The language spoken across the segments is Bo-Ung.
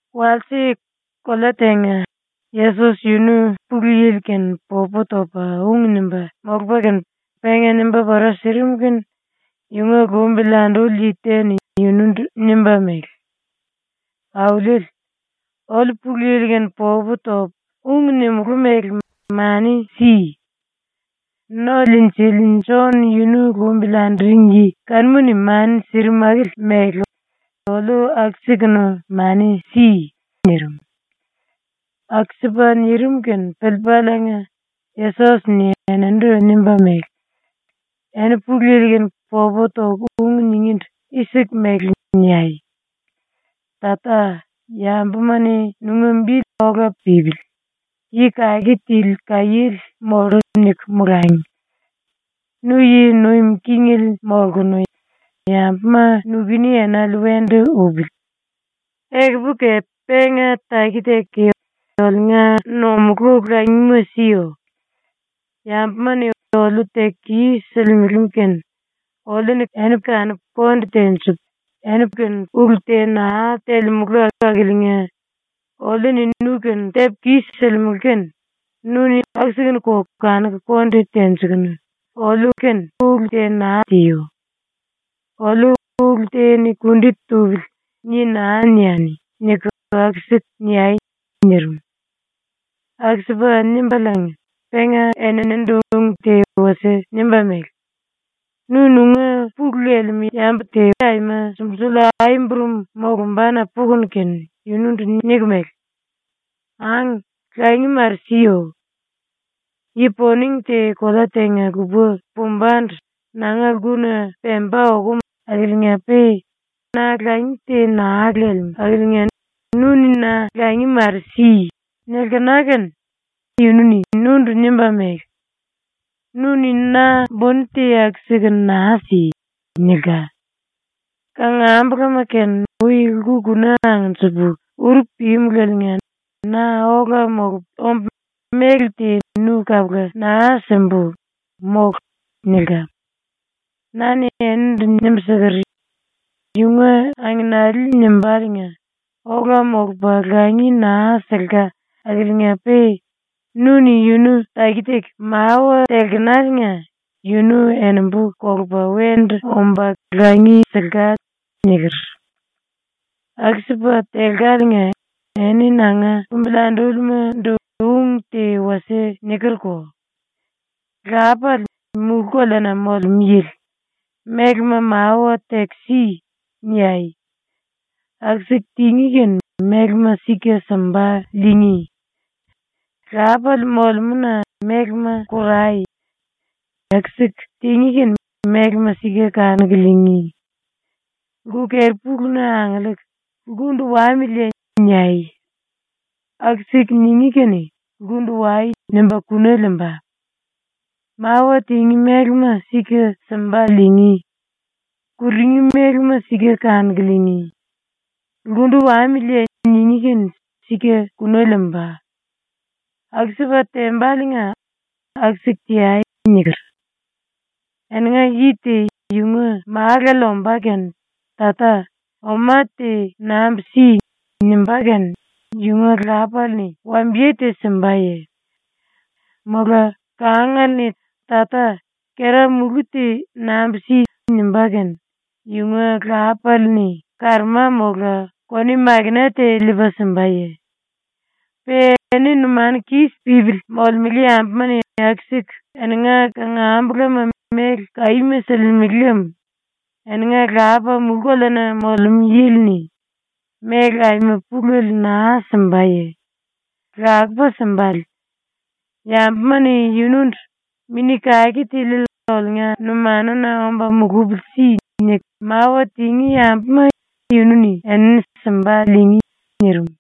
Walse, kolea tenga, Yesos yunu Pulu Yili-kene popu topa ung nimba molupa kene penga nimba pora sirim kene yunga lumbili anduring yi te-ni yunundu nimba mele: “Auliele, oliu Pulu Yili-kene popu topu ung nimulú mele mani si. ⸤No-Liinjili⸥ Jon yunu lumbili anduring yi kanuma mani sirim akili mele oliu aku-sikunu mani si.” nirim. ⸤Aku-sipa nirim kene piliipaliinga⸥ Yesos-ni eninindu nimba mele: “Eni Pulu Yili-kene popu toku ung ningíndu i-siku mele niai: “Tata, yambuma-ni ‘Nunga bi ola pípili, yi kake tili kaiéle mollu.’ niku molangi. Nu yi nuim kingele molkunu yambuma nukuni enale wendu upili. Ekupu kepe penga taki-taki oliunga nomulú langima siyo. Yambuma-ni oliu teku kis-silimele kene oliu-ni kanupu konde tenjipu ulu te naa telemulu akiliinga oliu-ni nu-kene tepu kis-silimulu kene nu-ni aku-sikunuko kanuku konde tenjikunu oliu ulu te naa tiyo. Oliu ‘Ulu te-ni kundi tupili.’ ni naa niani.” niku aku-siku niai.” nirim. Aku-sipa nimbaliinga penga eninindu ung te wasie nimba mele: “Nu nunga pulu lelemú yambu te aima sumbulsuli ai-burum molumbana pukunu kene yunundu niku mele: “Ang, langi mare siyo. Yi-poning te kolea tenga-lupa pumbandu nanga lkuna pemba okum akiliinga-pe na langi te naa lelemú akiliinga nu-ni na langi mare si.” nilkena kene yunu-ni nundu nimba mele: “Nu-ni na buni te aku-sikunu naa si.” nilka. “Kangambulama kene ui lku-kuna angnjipu uru pímulaliinga na ola molupu ombu méle te nu kapula naa simbu, mólu.” nilka. “Na-ni enindu nimbu siker: “Yunga angenale nimbaliinga ola molupa langi naa silka akiliinga-pe nu-ni yunu taki-taki mawa telkenaliinga yunu enimbu kolupa wendu omba langi silka.” niker. “Aku-sipa telkaliinga eni ⸤nanga lumbili andúlima⸥ ndu ung te wasie nikerko: “⸤lápale, Mulú-Koleana Molemú Yili,⸥ mélema mawa teku “Si.” niai. Aku-siku tingí kene mélema sika simba liingí. ⸤lápale molemúna⸥ mélema korai. Aku-siku tingí kene mélema sika kanuku liingí. Lku-keri-puluna angiliiku “Lkundu wamiliye.” niai. Aku-siku ningí kene “Lkundu wai.” nimba kuna liimba. Mawa tingí mélema sika simba liingí, kurungí mélema sika kanuku liingí, “Lkundu wamiliye.” ningí kene sika kuna liimba. Aku-sipa tembaliinga aku-siku teai.” niker. “Eninga yi te yunga málale omba kene “Tata, oma te nambu si.” nimbá kene yunga lápale-ni wambiye te simbaye? Mola kangale-ni “Tata, kera-múlu te nambu si.” nimbá kene yunga lápale-ni karoma mola koniwe-makena te liipa simbaye? Pe eni numanu kis pípili molemele yambuma-ni aku-siku eninga kangambulama méle kaíma silimele lem, eninga Lapa Mulú-Koleana Molemú Yili-ni ⸤méle aima pulele naa simbaye? Lakupa simbale.⸥ Yambuma-ni yunundu “Mini Kake Tiliele oliunga numanuna omba mulupili si.” niku mawa tingí yambuma yunu-ni enini simba liingí.” nirim.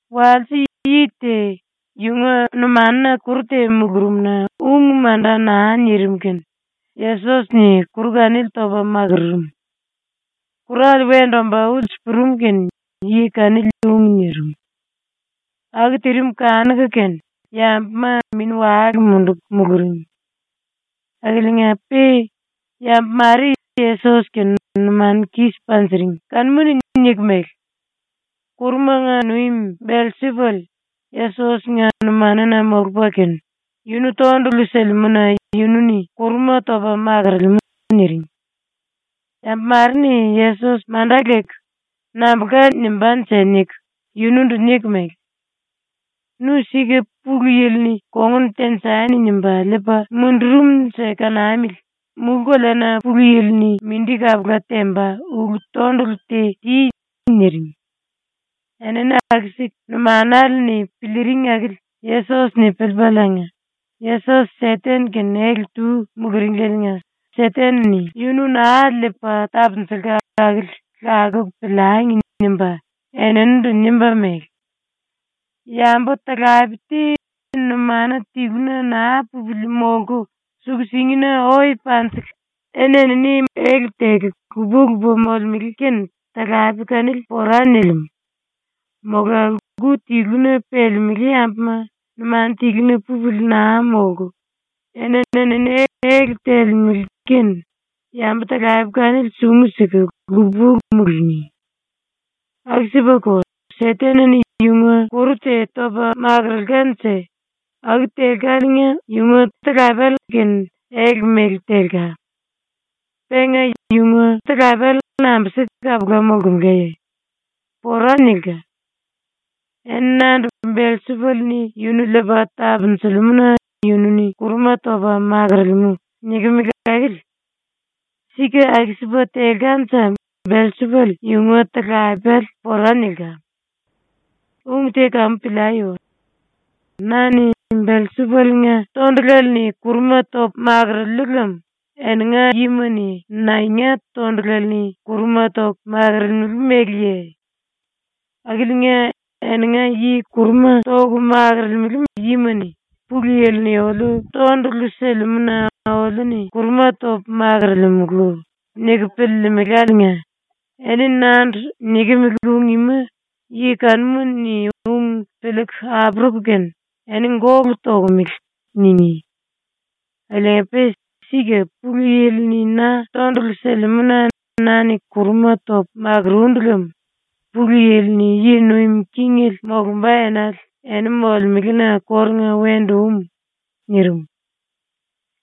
Walse yi te yunga numanuna kuru te mulurum-na ung manda naa nirim kene Yesos-ni kuru kanili topa makururum. Kurale wendu omba ulsu purum kene yi kanili ung nirim. Aku tirim kanuku kene yambuma mini-wale munduku muluring. Akiliinga-pe yambu mare ⸤Yesos-kene numanu kis panjiring⸥ kanuma-ni niku mele: “Kurumanga nuim Belsipull Yesos-nga numanuna molupa kene yunu tondulu silimú-na yunu-ni kuruma topa makorolemú.” niring. Yambu mare-ni Yesos manda leku “Nambulka nimbánje.” niku yunundu niku mele: “Nu sika Pulu Yili-ni ‘Kongun tenjani.’ nimba liipa mundurumnje kanamili, mulú-koleana ⸤Pulu Yili-ni mindi kapula temba⸥ ulu-tondulu te ti.” niring. Enini aku-siku numanale-ni piliiring akili Yesos-ni piliipaliinga ‘⸤Yesos Seten-kene ele-tu muluringlieliinga Seten-ni yunu naa liipa tapunjulka akili lakuku piliangi.’ nimba⸥ eninindu nimba mele: “Yambu-talape te numanu tiluna naa pupili molku suku-singina oe panjiku eni-enini ele teku lupa-lupa molemele kene talape kanili pora nilimú. ⸤Mola⸥ lku tiluna pelemelé yambuma numanu tiluna pupili naa molku eni-enini ele telemele kene yambu-talape kanili sungu siku lupa-lupa mulungí. Aku-sipako, Seten-ni yunga kuru te topa makurulkanje aku telkaliinga yunga talapele kene ele mele telka. Penga yunga talapele nambi-sipa kapula molkemelaye? ⸤Pora nilka.⸥ Eni nandu “Belsipull-ni yunu liipa tapunjilimú-na yunu-ni kuruma topa makorolemú.” nikimili akili. Sika aku-sipa telkanje Belsipull yunga talapele pora nilka. “Ung te kamu piliai. Na-ni Belsipull-nga tondulale-ni kuruma topu makuruliu lem eninga yima-ni naenga tondulale-ni kuruma toku makurulemeleye? Akiliinga, ⸤eninga yi kuruma toku makorolemele yima-ni ‘Pulu Yili-ni oliu tondulu silimú-na oliu-ni kuruma topu makorolemulu.’ niku piliilimiláliinga⸥ eni nandu nikimili ung ima yi kanuma-ni ung piliiku apuruku kene “Eni gólu tokomele.” ningí. Akiliinga-pe sika Pulu Yili-ni na tondulu silimú-na na-ni kuruma topu makurundu lem Pulu Yili yi nuim kingele molumba enale eni molemelena kórunga wendu um.” ⸤nirim.⸥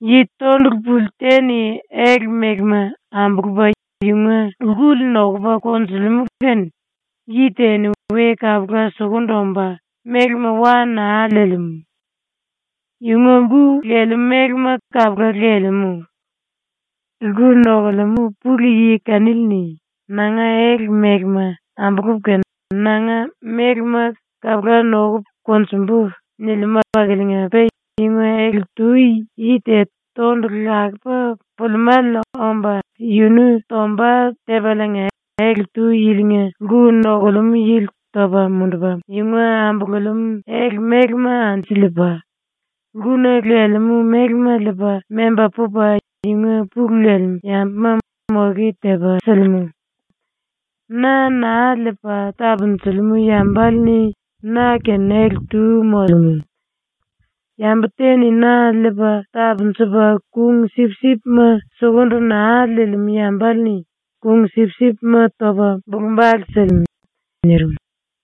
“Yi tondulu puli te-ni ele mélema ambulupa yunga lkuli nokupa konjulimú kene yi te-ni we kapula sukundu omba mélema wa naa liilimú. Yunga lku lelemú mélema kapula lelemú. Lku nokulemú pulu yi kanili-ni ‘Nanga ele mélema ambulupu kene nanga mélema kapula nokupu konjumbu.’ nilimú akiliinga-pe yunga ele-tu yi te tondulu lakupa pulimále omba yunu tomba tepaliinga ele-tu yilinga lku nokulemú yili topa mundupa yunga ambululemú ele mélema anju liipa, lkuna lelemú mélema liipa memba pupa yunga pulu lelemú yambuma moke tepa silimú. “Na naa liipa tapunjilimú yambale-ni na-kene ele-tu molemú. Yambu te-ni na liipa tapunjupa ⸤kung-sipsipma⸥ sukundu naa liilimú yambale-ni ⸤kung-sipsipma⸥ topa bulu-bale silimú.” ⸤nirim.⸥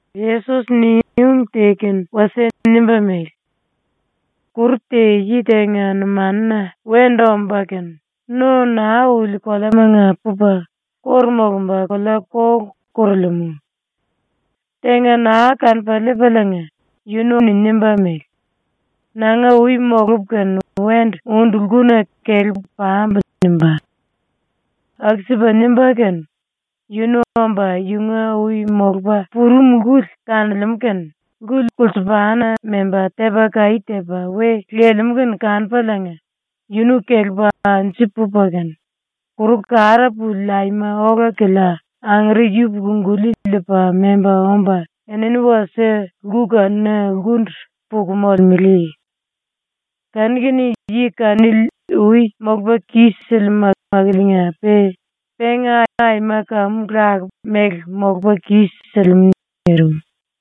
⸤Yesos-ni ung te kene wasie nimba mele:⸥ “Kuru te yi tenga numanuna wendu omba kene, no naa uli koleamanga pupa kóru molumba kolea-kolu korolemú. Tenga naa kanupa liipaliinga yunu-ni nimba mele: ‘Nanga ui molupu kene wendu undu lkuna kelepu pambu.’ nimbá. Aku-sipa nimba kene yunu omba yunga ui molupa purum lkuli kanolemú kene, lku kulsupana memba tepa kaí tepa we lelemú kene kanupaliinga yunu kelepa anju pupa kene, kuru kara puli aima ola-kilia angere yupuku-guli liipa memba omba enini wasie lku kanuna lkundu puku molemele. Kanu-kene yi kanili ui molupa kis-silimú akiliinga-pe penga aima kamu lakupa mele molupa kis-silimú.” nirim.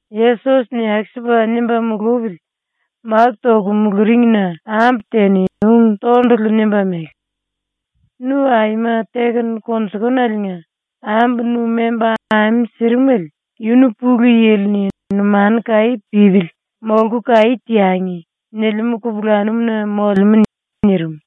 Yesos-ni aku-sipa nimba mulupili máku toku muluringna ambu te-ni ung tondulu nimba mele: “Nu aima tekunu konjullaliinga ambu nu memba ame sirimele yunu Pulu Yili-ni “Numanu kaí pípili molku kaí teangi.” nilimú kupulanum-na molemú.” nirim.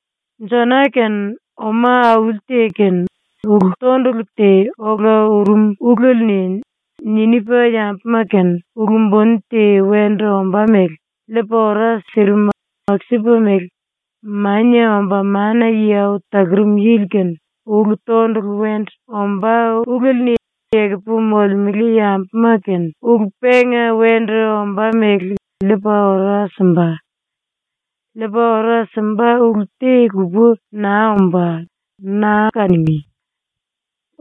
Jona-kene ⸤oma auli te-kene⸥ ulu-tondulu te ola urum ulele-ni Ninipa yambuma-⸤kene ulu buni te wendu ombá mele⸥ liipa ora sirim aku-sipa mele Mania Omba Mana-Yi Au Talurum Yili-kene ulu-tondulu wendu ombá ulele-ni ekupu molemele yambuma-kene ulu penga wendu ombá mele liipa ora simba. ⸤Liipa ora simba ulu te-lupa naa ombá, naa kanungí.⸥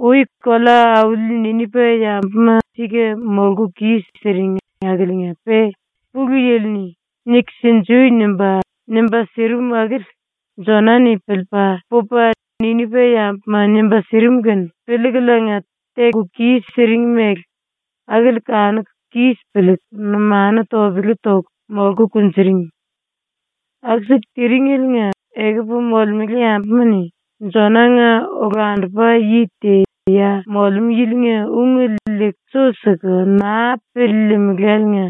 “Ui kolea-auli Ninipa yambuma ⸤sika molku kis-siring akiliinga-pe Pulu Yili-ni “Niku sinjui.” nimba, nimba sirim akili⸥ Jona-ni ⸤piliipa⸥ pupa Ninipa-yambuma nimba sirim kene piliikuliinga teku kis-siring mele akili kanuku kis piliiku numanu topele toku molku kunjuring. Aku-siku tiringeliinga ekupu molemele yambuma-ni Jona-nga olandupa yi te ya molemú yilinga ungele liiku su siku naa piliilimiláliinga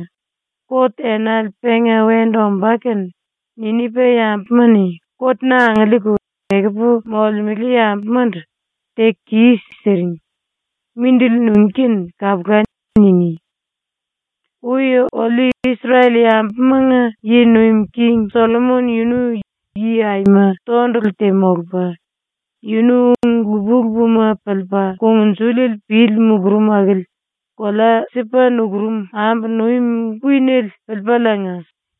kot enale penga wendu ombá kene Ninipa-yambuma-ni kot-na angiliiku, ekupu molemele yambumandu “Teku kis-siring. Mindili nungí kene kapula.” ningí. “Ui ⸤oliu Isrel-yambumanga yi nuim king⸥ Sollomon yunu yi aima tondulu te molupa, yunu ung lupa-lupama piliipa kungnjuliele pili mulurum akili kolea Sipa nukurum ambu nuim kuinele piliipaliinga,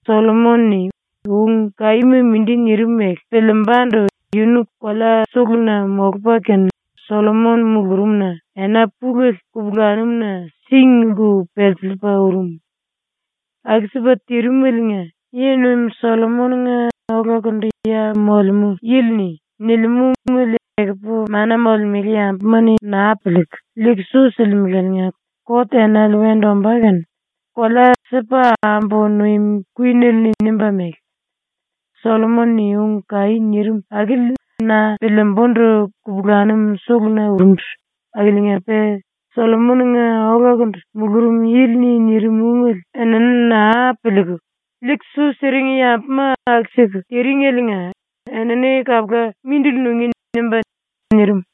Sollomon-ni ung kaíma mindi nirim mele piliimbandu yunu kolea suluna molupa kene ⸤Sollomon mulurumna⸥ ena pulele kupulanum-na sing-lku pelsiliipa urum. Aku-sipa tirimeliinga, yi-nuim Sollomon-nga olakundu ya molemú yili-ni nilimú ungele ekupu mana molemele yambuma-ni naa piliiku, liiku su silimeláliinga kot enale wendu ombá kene kolea Sipa ambu nuim kuinele-ni nimba mele: “Sollomon-ni ung kaí nirim akili na piliimbundu kupulanum suluna urundu akiliinga-pe Sollomon-nga olakundu mulurum yili-ni nirim ungele enini naa piliiku, liiku su siring yambuma aku-siku tiringeliinga enini kapula mindili nungí.” nimbá.” ⸤nirim.⸥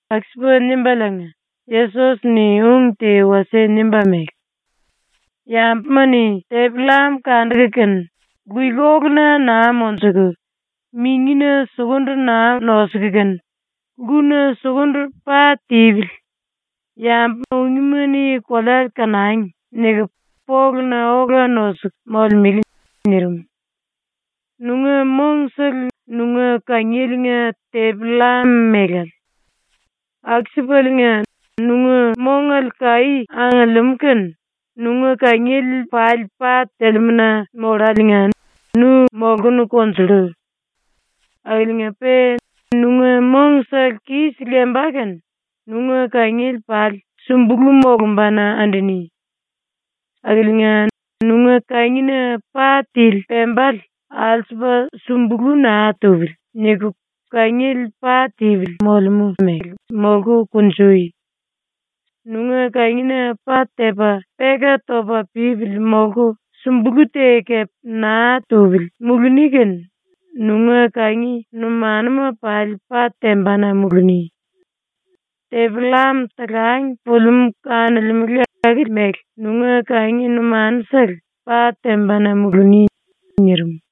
⸤Aku-sipa nimbaliinga Yesos-ni ung te wasie nimba mele:⸥ “Yambuma-ni tepi-llam kanduku kene luikolu-na naa monjuku, mingina sukundu naa nosuku kene ‘Lkuna sukundu pa tipili. Yambu ungíma-ni kolea kanangi.’ niku poluna ola nosuku molemele.” ⸤nirim.⸥ “Nunga mongsele nunga kangieliinga tepi-llam melale. Aku-sipaliinga nunga mongale kaí angiliimú kene nunga kangiele pali pa telemú-na molláliinga nu molkunu konjullu. Akiliinga-pe nunga mongsele kis lemba kene nunga kangiele pali sumbulú molombana anduni. Akiliinga, nunga kangina pa tili pembale ‘alsupa sumbulú naa tupili.’ niku ⸤kangiele pa tipili molemú mele molku kunjui⸥. Nunga kangina pa tepa peka topa pípili molku sumbulú te kepe naa tupili muluni kene nunga kangi numanuma pali pa tembana muluni. Tepi-llam talang pulimú kanolemulu akili mele nunga kangi numanusele pa tembana muluni.” nirim.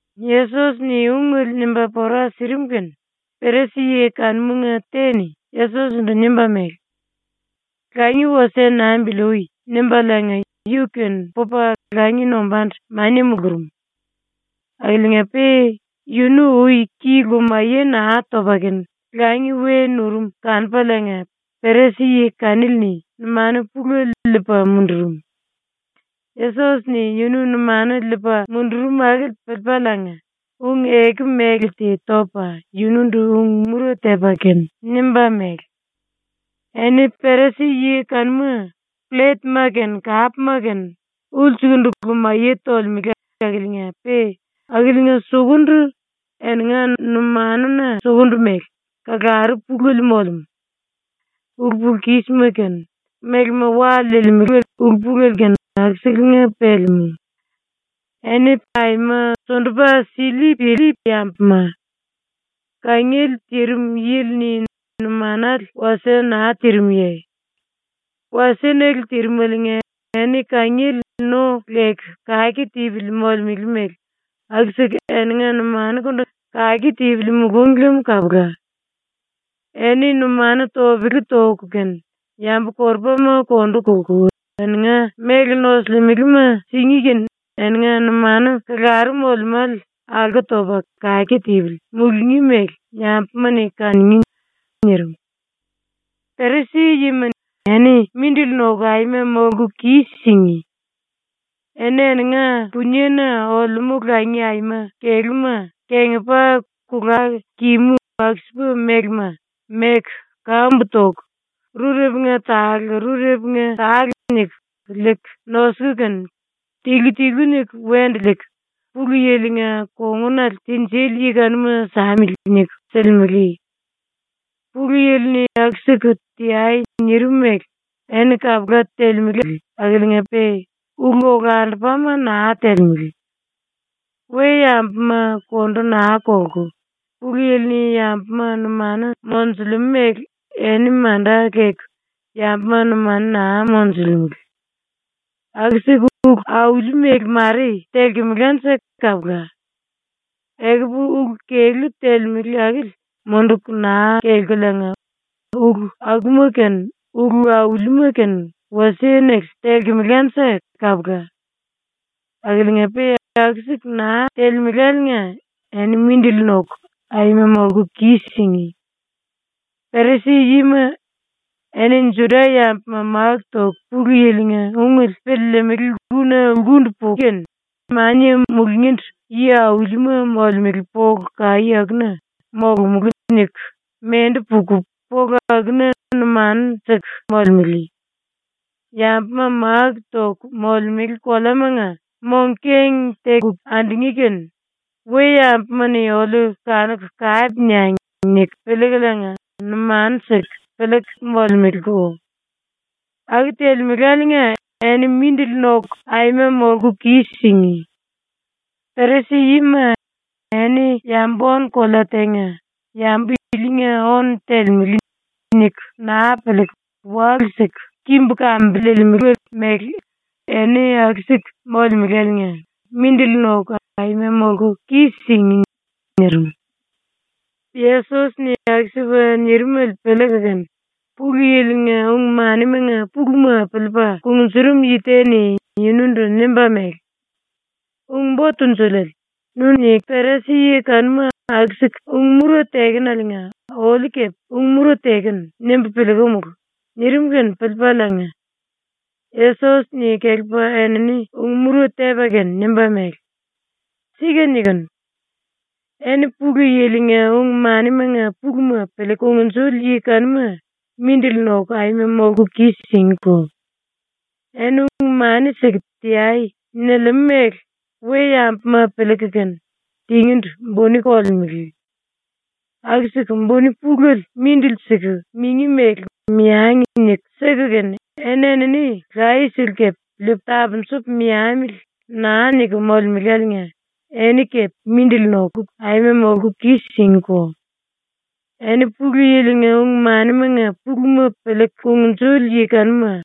Yesos-ni ungele nimba pora sirim kene Perisi-yi kanumanga te-ni Yesos-ndu nimba mele: “Langi wasie nambili ui.” nimbaliinga yu-kene pupa langi nombandu mania mulurum. Akiliinga-pe yunu ui ki lumaye naa topa kene langi we nurum kanupaliinga Perisi-yi kanili-ni numanu pulele liipa mundurum. Yesos-ni ⸤yunu numanu liipa mundurum akili⸥ piliipaliinga ⸤ung-eku mele te topa⸥ yunundu ⸤ung-mura tepa kene⸥ nimba mele: “Eni Perisi-yi kanuma plletma kene kapma kene ulsukundu lumaye tolemele akiliinga-pe akiliinga sukundu, eninga numanuna sukundu mele, kalaru pulele molemú. Ulu-pulu-kísima kene, mélema wa liilimele ulu-pulele kene akuselenga pelemú. Eni aima sundupa sili-pili yambuma. Kangiele tirim yili-ni numanale wasie naa tirimuye? ⸤Walse-nele tirimeliinga⸥ eni kangiele no leku kake tipili molemele mele aku-siku eninga numanukundu kake tipili mulúngi lem kapula. Eni numanu topele toku kene yambu-korupama kondu kolku eninga méle nosulimelema singí kene eninga numanu kalaru molemále alko topa kake tipili mulungí mele yambuma-ni kanungí.” ⸤nirim.⸥ “Perisi-yima, eni mindili noku aima molku kis-singí! Eni eninga puniena olemú langi aima kelúma kengipa kulá kimú aku-sipa mélema meku kambu toku rurepunga tale rurepunga tale niku liiku nosuku kene tilu tilu niku wendu liiku ‘Pulu Yili-nga kongunale tinjili yi kanuma samili.’ niku silimele. Pulu Yili-ni aku-siku ‘Teai.’ nirim mele eni kapula telemele akiliinga-pe ulu olandupama naa telemele. We-yambuma kondu naa kolku, Pulu Yili-ni yambuma numanu monjulemú mele eni manda leku yambuma numanu naa monjulemele. Aku-siku ulu auli mele mare telkemelanje kapula. Ekupu ulu kelú telemele akili munduku naa kelkuliinga ulu akuma kene ulu aulima kene wasie-nele telkemelanje kapula. Akiliinga-pe aku-siku naa telemeláliinga eni mindili noku aima molku kis-singí! “Perisi-yima, eni Juda-yambuma máku toku Pulu Yili-nga ungele piliilimili lkuna lkundu puku kene mania mulungíndu yi-aulima molemele polu kaí akuna ‘molomulú.’ niku mendu puku polu akuna numanu siku molemele. Yambuma máku toku molemele koleamanga mong-keng teku andungí kene ‘We-yambuma-ni oliu kanuku kape niangi.’ niku piliikuliinga numanu siku piliiku molemeleko. Aku telemeláliinga eni mindili noku aima molku kis-singí! “⸤Perisi-yima,⸥ eni yambu-ónu-kolea tenga ‘Yambu ilinga ónu telemele.’ niku naa piliiku walu-siku kimbu kambiliilimele mele eni aku-siku molemeláliinga mindili noku aima molku kis-singí!” nirim. Yesos-ni aku-sipa nirimele piliiku kene Pulu Yili-nga ung-manimanga puluma piliipa kungnjurum yi te-ni yunundu nimba mele: “Ung-Bo Tunjuliele, ‘Nu-ni Perisi-yi kanuma aku-siku ung-mura tekenaliinga oliu kepe ung-mura tekenu.’ nimbu piliikumulu.” nirim kene piliipaliinga Yesos-ni kelepa enini ⸤ung-mura tepa kene⸥ nimba mele: “Sika nikinu. Eni Pulu Yili-nga ung-manimanga puluma piliiku kungnjuli yi kanuma mindili noku aima molku kis-singíko! Eni ung-mani siku ‘Teai.’ nilimele mele we-yambuma piliiku kene tingíndu buni kolemele. Aku-siku buni pulele mindili siku mingí mele ‘Meangi.’ niku siku kene eni-enini layesele kepe ‘Liipu tapunjupu meamili.’ naa niku molemeláliinga eni ⸤kepe⸥ mindili noku aima molku kis-singíko! “⸤Eni Pulu Yili-nga ung-manimanga puluma piliiku kungnjuli yi kanuma,⸥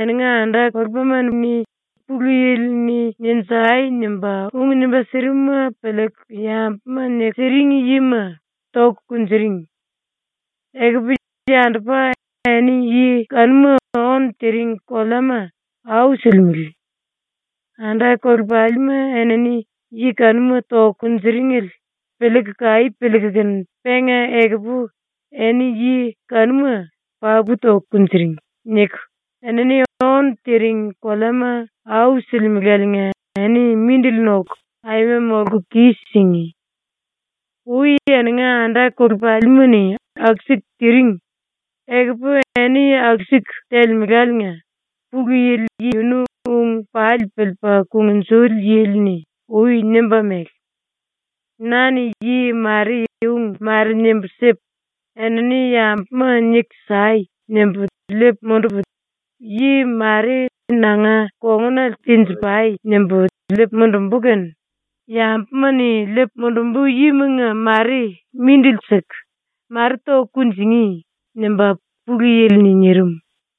eninga anda-kolepalima-ni Pulu Yili-ni “Ninjai!” nimba ung nimba sirimuma piliiku yambuma niku siring yima toku kunjuring. Ekupu, yandupa, eni yi kanuma ónu tiring koleama au silimele. Anda-kolepalima enini yi kanuma toku kunjiringele piliiku kaí piliiku kene penga ekupu eni yi kanuma ‘Papu toku kunjuring.’ niku enini ónu tiring koleama au silimeláliinga eni mindili noku aima molku kis-singí! “⸤Ui eninga anda-kolepalima-ni aku-siku tiring, ekupu eni aku-siku telemelá⸥liinga Pulu Yili yunu ung pali piliipa kungnjuli yili-ni ui nimba mele: “Na-ni yi mare ung mare nimbu sipu ‘Enini yambuma niku sai.’ nimbu liipu mundupu, yi mare ‘Nanga kongunale tenji-pai.’ nimbu liipu mundumbu kene yambuma-ni liipu mundumbu yimanga mare mindili siku, mare toku kunjingí.” nimba Pulu Yili-ni nirim.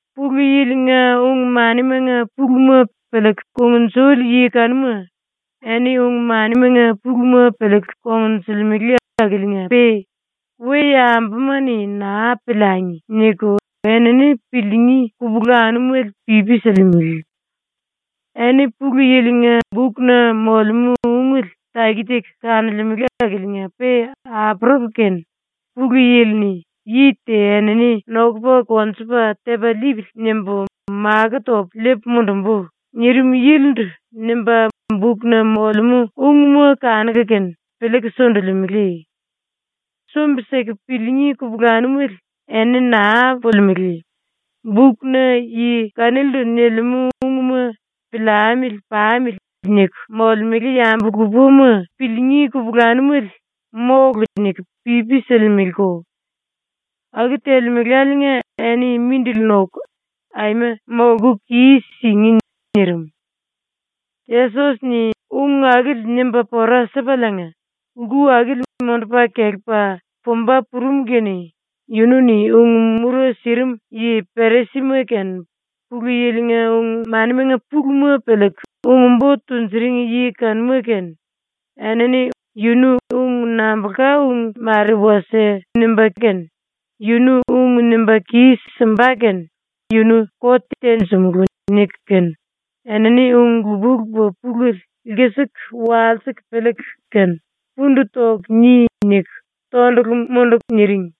“Pulu Yili-nga ung-manimanga puluma piliiku kungnjuli yi kanuma, eni ung-manimanga puluma piliiku kongnjulimele akiliinga-pe “We-yambuma-ni naa piliangi.” niku enini piliingí kupulanumele pipi silimele. Eni Pulu Yili-nga bukna molemú ungele taki-taki kanolemele akiliinga-pe apuruku kene Pulu Yili-ni “‘Yi te enini nokupa konjupa tepa liipili.’ nimbu makó topu liipu mundumbu.” nirim yilindu nimba bukna molemú ungma kanuku kene piliiku sundulimele. Sumbi-siku piliingí kupulanumele eni naa pulimelé; bukna yi kanilindu nilimú ungma ‘Piliamili pamili.’ niku molemele yambu lupama piliingí kupulanumele “Mólu.” niku pipi silimeleko. Aku telemeláliinga eni mindili noku aima molku kis-singí!” nirim. Yesos-ni ⸤ung akili nimba pora sipaliinga⸥ lku akili mundupa kelepa pumba purum kene yunu-ni ung-mura sirim yi-Perisima kene Pulu Yili-nga ung-manimanga puluma piliiku ung-bo tunjuring yi kanuma kene enini ‘Yu ung nambulka ung mare wasie nimba kene, yunu ung nimba kis-simba kene yunu kot tenjimulú.’ niku kene enini ung lupa-lupa pulele lkisiku walsiku piliiku kene “Pundu toku ni.” niku tondulu munduku niring.